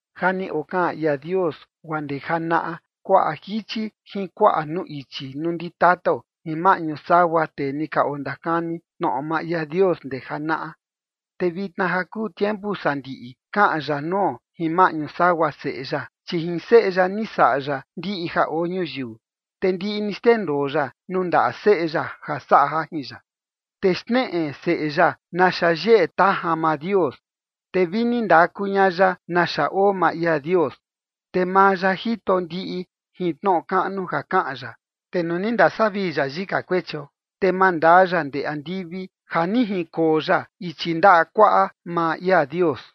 Ja ni okaꞌan ia Dios guaa ndee janaꞌa kuaꞌa jichi jin kuaꞌa nuu ichi nuu ndi tatao jin maꞌñu sagua tee ni ka ondakani tnoꞌo maa ia Dios ndee janaꞌa. Te vitna ja kuu tiempu sandiꞌi kaꞌan ya nuo jin maꞌñu sagua Seꞌe ya, chi jin seꞌe ya ni saꞌa ya ndiꞌi ja oo ñuyiu, te ndiꞌi ni xndendoo ya nuu ndaꞌa Seꞌe ya ja saꞌa jajin ya. Te xneꞌe Seꞌe ya naxa yeꞌe tajan maa Dios, te vi ni ndaku ña ya naxa oo maa ia Dios, te maa ya jito ndiꞌi jin tnoꞌo kaꞌnu ja kaꞌan ya. Te nuu ni ndasavii ya yika kuechio, te mandaa ya ndee andivi ja ni jinkoo ya ichi ndaꞌa kuaꞌa maa ia Dios.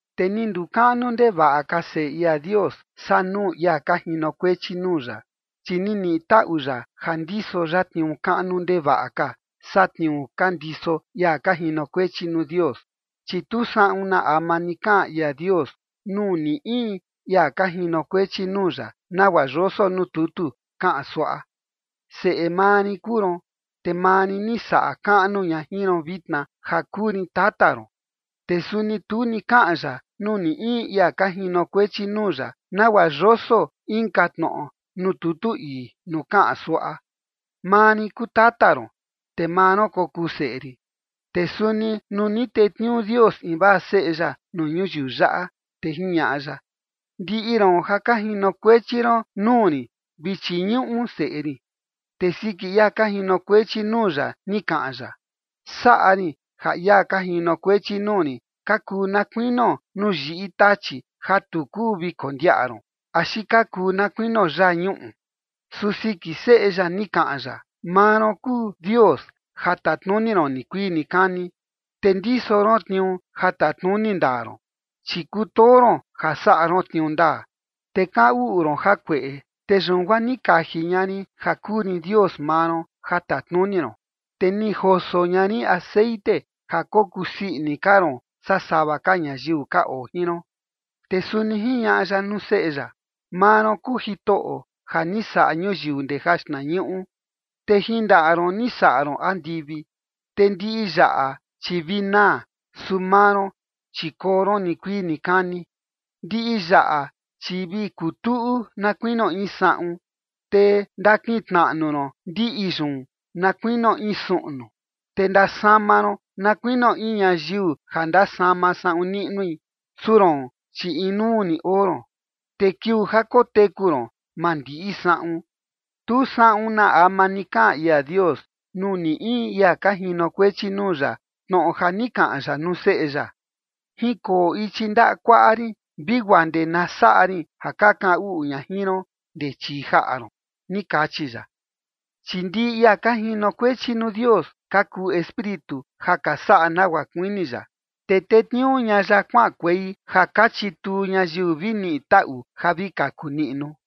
Te ni ndukaꞌnu ndevaꞌa ka Seꞌe ia Dios saa nuu ia ka jinokuechi nuu ya, chi ni niꞌi taꞌu ya ja ndiso ya tniuu kaꞌnu ndevaꞌa ka saa tniuu ka ndiso ia ka jinokuechi nuu Dios. Chi tu saꞌun na ama ni kaꞌan ia Dios nuu ni in ia ka jinokuechi nuu ya nagua yoso nuu tutu kaꞌan suaꞌa: Seꞌe maa rin kuu ron, te maa rin ni saꞌa kaꞌnu ña jin ron vitna, ja kuu rin tata ron. Te suni tu ni kaꞌan ya nuu ni in ia ka jinokuechi nuu ya nagua yoso inka tnoꞌo nuu tutu ii nuu kaꞌan suaꞌa: Maa rin kuu tata ron, te maa ron kokuu seꞌe rin. Te suni nuu ni tetniuu Dios invaa Seꞌe ya nuu ñuyiu yaꞌa, te jiñaꞌa ya: Ndiꞌi ron ja ka jinokuechi ron nuu rin vi chiñuꞌu Seꞌe rin. Te siki ia ka jinokuechi nuu ya, ni kaꞌan ya: Saꞌa rin ja ia ka jinokuechi nuu rin ka kuu na kuinio nuu yiꞌi tachi ja tu kuu vi kondiaꞌa ron, axi ka kuu na kuinio yañuꞌu. Su siki Seꞌe ya ni kaꞌan ya: Maa ron kuu Dios ja tatnuni ron nikuii nikani, te ndiso ron tniuu ja tatnuni ndaa ron. Chi kutoo ron ja saꞌa ron tniuu ndaa, te kaꞌan uꞌu ron jakueꞌe. Te yun guaa ni kaji ña rin ja kuu rin Dios maa ron ja tatnuni ron, te ni joso ña rin texeꞌen ja kokuu sii ini ka ron saa sava ka ñayiu ka oo jin ron. Te suni jiñaꞌa ya nuu Seꞌe ya: Maa ron kuu Jitoꞌo ja ni saꞌa ñuyiu ndee jaxtnañuꞌu, te jin ndaꞌa ron ni saꞌa ron andivi. Te ndiꞌi yaꞌa chi vi naa, su maa ron, chi koo ron nikuii nikani. Ndiꞌi yaꞌa, chi vi kutuꞌu na kuinio in saꞌun. Te ndakintnaꞌnu ron ndiꞌi yun na kuinio in suꞌnu, te ndasama ron na kuinio in ñayiu ja ndasama saꞌun niꞌnui. Su roon, chi inuu ni oo ron, te kiuu ja koteku ron, maa ndiꞌi saꞌun. Tu saꞌun na ama ni kaꞌan ia Dios nuu ni in ia ka jinokuechi nuu ya tnoꞌo ja ni kaꞌan ya nuu Seꞌe ya: Jinkoo ichi ndaꞌa kuaꞌa rin vi guaa ndee na saꞌa rin ja ka kaꞌan uꞌu ña jin ron ndee chii jaꞌa ron, ni kachi ya. Chi ndiꞌi ia ka jinokuechi nuu Dios ka kuu espíritu ja ka saꞌa nagua kuini ya, te tetniuu ña ya kuaꞌankuei ja ka chituu ñayiu vi niꞌi taꞌu ja vi kaku niꞌnu.